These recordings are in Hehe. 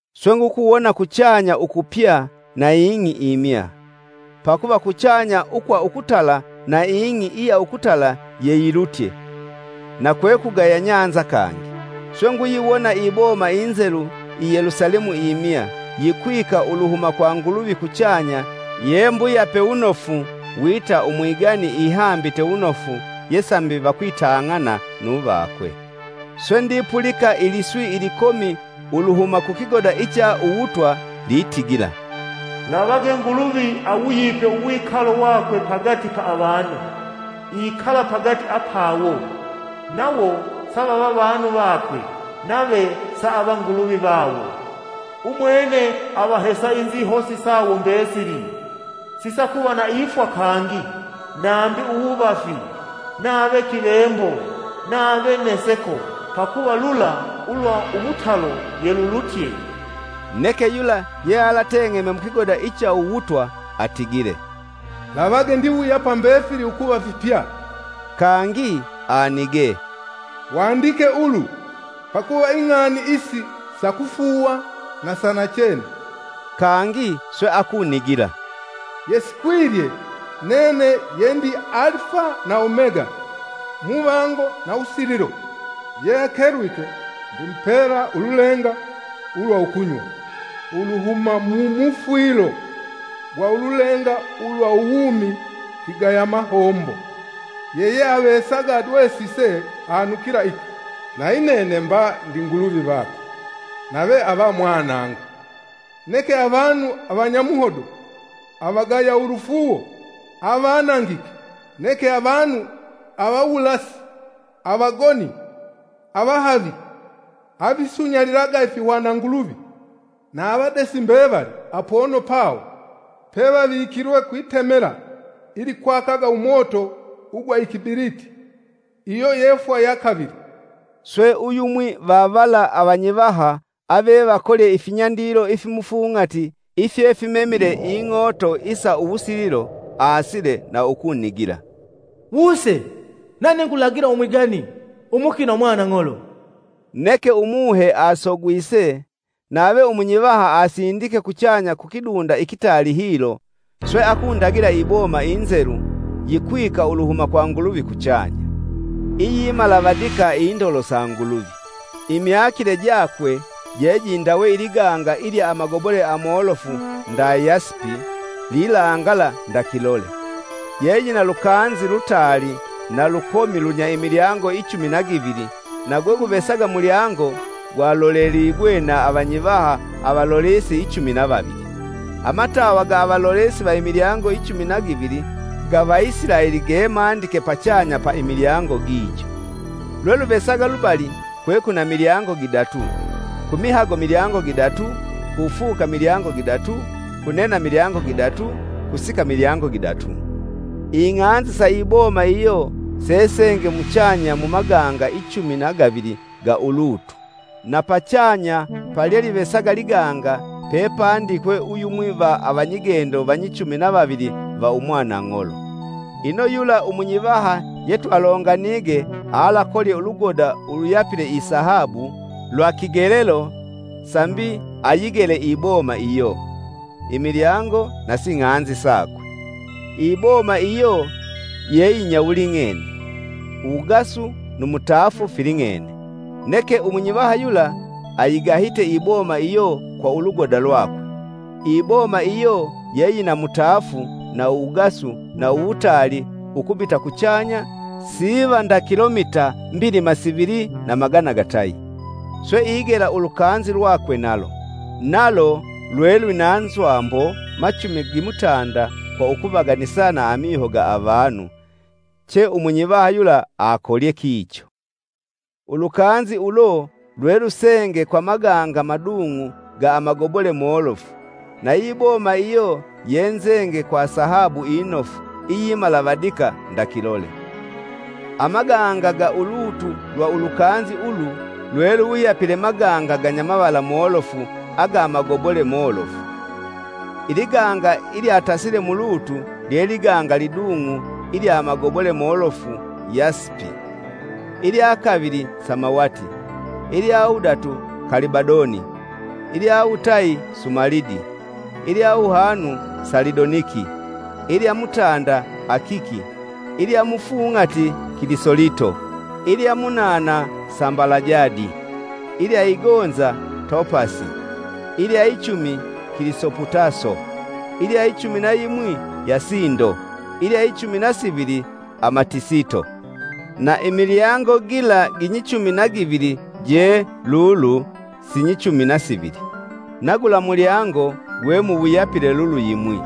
Swe ngukuwona kuchanya ukupya na ing'i imya. Pakuva kuchanya ukwa ukutala na ing'i iya ukutala yeyilutye na kwekugaya bahali kangi. Swe nguyiwona iboma inzelu, i Yelusalemu imya, yikwika uluhuma kwa Nguluvi kuchanya ye mbuyape wunofu wita umwigani ihambite wunofu ye sambi vakwitang'ana nu vakwe. Swe ndipulika iliswi ilikomi uluhuma ku kigoda icha uwutwa litigila, “Lavage Nguluvi awuyipe uwikalo wakwe pagati pa avanu. Ikala pagati apawo, nawo savava vanu vakwe, nave saava Nguluvi vawo. Umwene avahesa inzihosi sawo mbesili, sisakuva na ifwa kangi, nambi uwuvafi, nave kivembo, nave neseko, pakuva lula ulwa umutalo yelulutye!” Neke yula yealateng'eme mukigoda icha uwutwa atigile, “Lavage ndiwuyapa mbefili ukuva fipya.” Kangi anigee, “Wandike ulu, pakuva ing'ani isi sa kufuuwa na sanachene.” Kangi swe akunigila, “Yesikwilye, nene yendi Alifa na Omega, Muvango na Wusililo. Ye akelwike ndimupela ululenga ulwa ukunywa uluhuma mumufwilo gwa ululenga ulwa uwumi kigaya amombo. Yeyeavesaga adwesise anukila iki, nayi nene mba ndi Nguluvi vakwe nave ava mwanangu. Neke avanu avanyamuhodo, avagaya ulufuuwo, avanangike, neke avanu, avawulasi, avagoni, avahavi, avisunyalilaga ifihwananguluvi, na avadesi mbevali apono pawo pevavikilwe kwitemela ilikwakaga umoto ugwa ikibiliti, iyo yefwaa ya kavili.” Swe uyumwi va vala avanyivaha avevakolye ifinyandilo ifimufung'ati ifyefimemile ing'ooto isa uwusililo, aasile na ukunigila, “Wuse! Nane ngulagila umwigani, umukina Umwanang'olo!” Neke Umuhe asogwise, nave umunyivaha anzindike kuchanya kukidunda, ikitaali hilo swe akundagila iboma inzelu, yikwika uluhuma kwa Nguluvi kuchanya, iyimalavadika indolo sa Nguluvi. Imyakile jakwe jejindawe iliganga ilya amagobole amolofu nda Yasipi lilangala nda kilole. Ye yina lukanzi lutaali na lukomi lunya imilyango ichumi na givili na gweguvesaga mulyango gwa loleligwe na avanyivaha avalolesi ichumi na vavili. Amatawa ga avalolesi va imilyango ichumi na gavili ga Vaisilaeli gemandike pachanya pa imilyango gijo. Lweluvasaga lubali kwekwina milyango gidatu, kumihago milyango gidatu, kufuka milyango gidatu, kunena milyango gidatu, kusika milyango gidatu. Ing'anzi sa iboma iyo sesenge muchanya mu maganga ichumi na gavili ga ulutu, na pachanya palyelivesaga liganga pepandikwe uyumwi va avanyigendo vanyichumi na vavili va Umwanang'olo. Ino yula umunyivaha yetwalonganige alakolye ulugoda uluyapile isahabu lwa kigelelo sambi ayigele iboma iyo, imilyango nasi ng'anzi sakwe. Iboma iyo yeyinyawuling'ene uwugasu nu mutaafu filing'ene, neke umunyivaha yula ayigahite iboma iyo kwa ulugoda lwakwe, iboma iyo yeyina mutaafu na uwugasu na uwutaali ukubita kuchanya siva nda kilomita mbilima sivili na magana gatayi. Swe igela ulukanzi lwakwe nalo; nalo lwe lwina nzwambo machumi gimutanda kwa ukuvaganisa na amiho ga avanu, che umunyivaha yula akolye kicho. Ulukanzi ulo lwe lusenge kwa maganga madung'u ga amagobole molofu, nayi boma iyo yenzenge kwa sahabu inofu, iyimalavadika nda kilole. Amaganga ga ulutu lwa ulukanzi ulu lweluwuyapile maganga ganyamavala molofu aga magobole molofu. Iliganga ilya tasile mulutu lyeliganga lidung'u ilya amagobole molofu yasipi, ilya kavili samawati, ilya wudatu kalibadoni ilyawutayi sumalidi, ilya wuhanu salidoniki, ilya mutanda akiki, ilya mufung'ati kilisolito, ilya munana sambalajadi, ilya igonza topasi, ilya ichumi kilisoputaso, ilya ichumi na yimwi yasindo, ilya ichumi na sivili amatisito. Na imilyango gila ginyichumi na givili je lulu sinyichumi na givili. Na gula mulyango gwemuwuyapile lulu yimwi.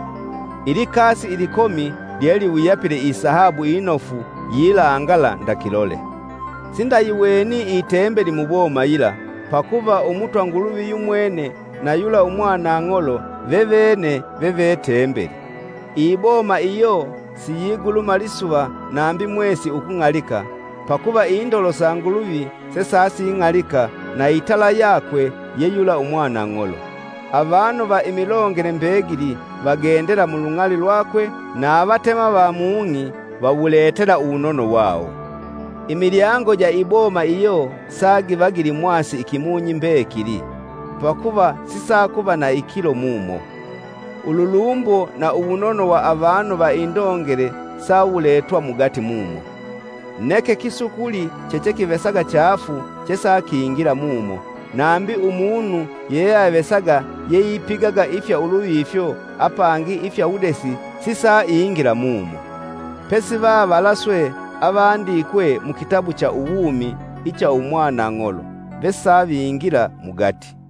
Ilikasi ilikomi lyeliwuyapile isahabu inofu yilangala nda kilole. Sindayiweni itembeli muboma yila, pakuva Umutwa Nguluvi yumwene na yula Umwanang'olo vevene ve vetembeli. Iboma iyo siyiguluma lisuva nambi mwesi ukung'alika, pakuva indolo sa Nguluvi sa sesasing'alika na itala yakwe ye yula Umwanang'olo. Avanu va imilongele mbegili. Vagendela mulung'ali lwakwe na avatema va mung'i vawuletela uwunono wawo. Imilyango ja iboma iyo sagiva gilimwasi ikimunyi mbekili, pakuva sisakuva na ikilo mumo. Ululumbo na uwunono wa avanu va indongele sauwuletwa mugati mumo. Neke kisukuli chechekivesaga chaafu chesakingila mumo, nambi umunu yeyeavesaga yeipigaga ifya uluvifyo apangi ifya uwudesi sisaingila mumo. Pesivavala swe avandikwe mukitabu cha uwumi icha Umwanang'olo, vesavingila mugati.